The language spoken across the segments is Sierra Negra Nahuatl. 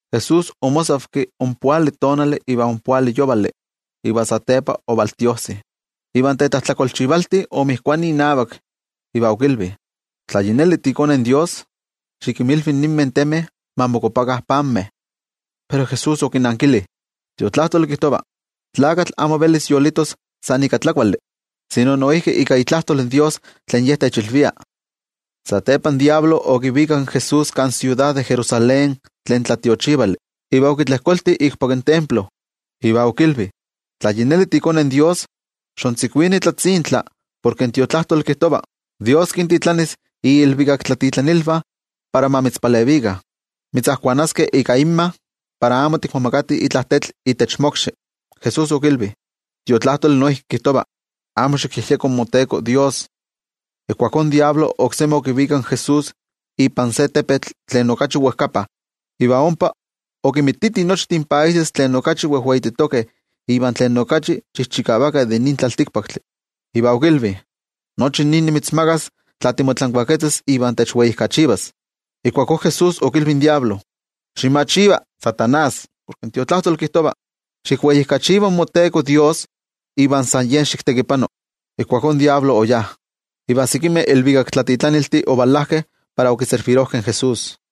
Jesús omosavki ompoali tonali iva ompoali yovali, iva satepa otiojsi. Iva in tetlajtlakolchivalti omotoki inavak, iva okilvi: —Tla yi neli tiiKone in Dios, xikinmilvi ninmeh temeh ma mokuapakah panmeh. Pero Jesús okinankili: —In Tiotlajkuiloli kijtova: “In tlakatl amo velis yolitos san ika tlakuali, sino noijki ika itlajtol in Dios tlen Ye techilvia.” Satepa in Amo Kuali Tlakatl okivikak in Jesús kan siudad de Jerusalén tlen tlatiochivali, iva okitlejkolti ikpak in templo iva okilvi: —Tla yi neli tiiKone in Dios, xontzikuini tlatzintla, porke in Tiotlajkuiloli kijtova: Dios kintitlanis iilvikaktlatitlanilvah para ma mitzpalevikah. Mitzajkuanaskeh ika inmavah, para amo tikmomakati itla tetl itech mokxi. Jesús okilvi: —In Tiotlajkuiloli noijki kijtova: “Amo xikyejyeko in moTeko Dios.” Ijkuakó in Amo Kuali Tlakatl oksemi okivikak in Jesús ipan se tepetl tlen okachi wejkapa, iva ompa okimititi nochtin países tlen okachi wejweititokeh iva tlen okachi chijchikavakeh de nin tlaltikpaktli, iva okilvi: —Nochi nin nimitzmakas, tla timotlankuaketzas iva techweijkachivas. Ijkuakó Jesús okilvi in Amo Kuali Tlakatl: —Ximachiva, Amo Kuali Tlakatl, porke in Tiotlajkuiloli kijtova: “Xikweijkachiva in moTeko Dios, iva san Ye xiktekipano.” Ijkuakó in Amo Kuali Tlakatl oyá, iva sekimeh ilvikaktlatitlaniltih ovalajkeh para okiservirojkeh in Jesús.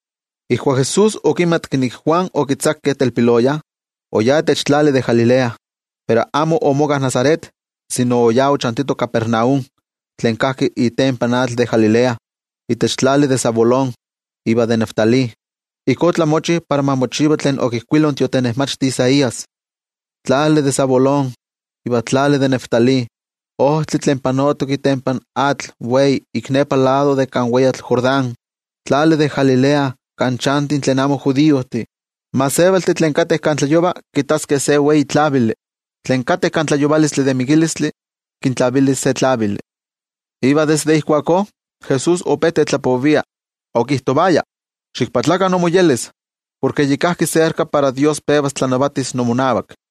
Ijkuak Jesús okimatki nik in Juan okitzakeh telpiloya, oyá itech tlali de Galilea. Pero amo omoka Nazaret, sino oyá ochantito Capernaum, tlen kajki itempan atl de Galilea, itech tlali de Zabulón iva de Neftalí. Ijkó otlamochi para ma mochiva tlen okijkuilo in tiotenejmachti Isaías: Tlali de Zabulón iva tlali de Neftalí, ojtli tlen panotok itempan atl tlen wei, ik nepa lado de kan weyatl Jordán, tlali de Galilea kan chantih tlen amo judiojtih. In gentejtih tlen kateh kan tlayova kittaskeh se wei tlavili. Tlen kateh kan tlayovalotl de mikilistli, kintlavilis se tlavili. Iva desde ijkuakó Jesús ope tetlapovia, okijtovaya: —Ximoyolkuapakah, porke yi kajki serka para Dios pevas tlanavatis imonavak.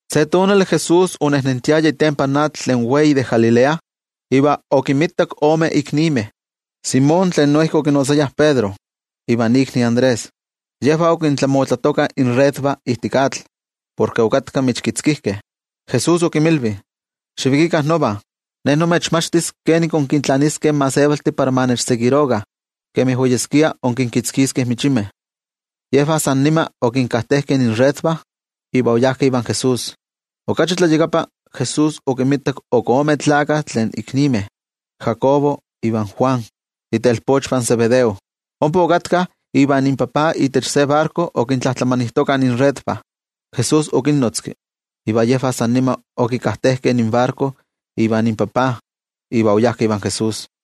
Se tonali Jesús onejnentiaya itempan atl tlen wei de Galilea, iva okinmitak ome iknimeh, Simón tlen noijki okinotzayah Pedro iva ikni Andrés. Yejvah okintlamotlatokah inredvah ijtik atl, porke okatkah michkitzkijkeh. Jesús okinmilvi: —Xivikikah nova. Ne nimechmachtis kenik inkintlaniskeh in gentejtih para ma nechseguirokah kemi oyeskia inkinkitzkiskeh michimeh. Yejvah san nima okinkajtejkeh inredvah iva oyajkeh ivan Jesús. Okachi tlayakapa, Jesús okinmitak ok ome tlakah iknimeh, Jacobo ivan Juan, itelpochvah in Zebedeo. Ompa okatkah ivan inpapa itech se barko okintlajtlamanijtokah inredvah. Jesús okinnotzki, iva yejvah san nima okajtejkeh inbarko ivan inpapa, iva oyajkeh ivan Jesús.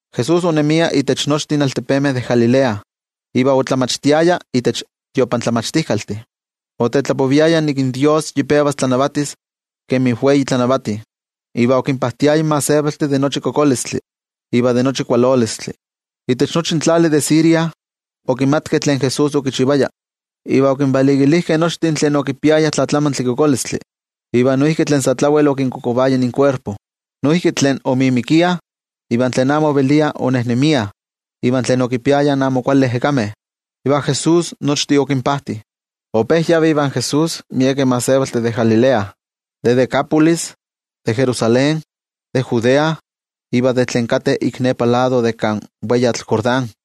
Jesús onemia itech nochtin altepemeh de Galilea, iva otlamachtijtiaya itech tiotlamachtijkaltih. Otetlapoviaya nik in Dios yi pevas tlanavatis kemi wei tlanavati. Iva okinpajtiaya in gentejtih de nochi kokolistli iva de nochi kualolistli. Itech nochi in tlali de Siria, okimatkeh tlen Jesús okichivaya, iva okinvalikilijkeh nochtin tlen okipiayah tlatlamantli kokolistli, iva noijki tlen sa tlawel okinkokovaya inkuerpo. Noijki tlen omimikiah, iva tlen amo oveliah onejnemiah iva tlen okinpiayah amo kuali ejekameh. Iva Jesús nochtin okinpajti. Ope kiseguirovah in Jesús miekeh gentejtih de Galilea, de Decápolis, de Jerusalén, de Judea, iva de tlen kateh ik nepa lado de kan weyatl Jordán.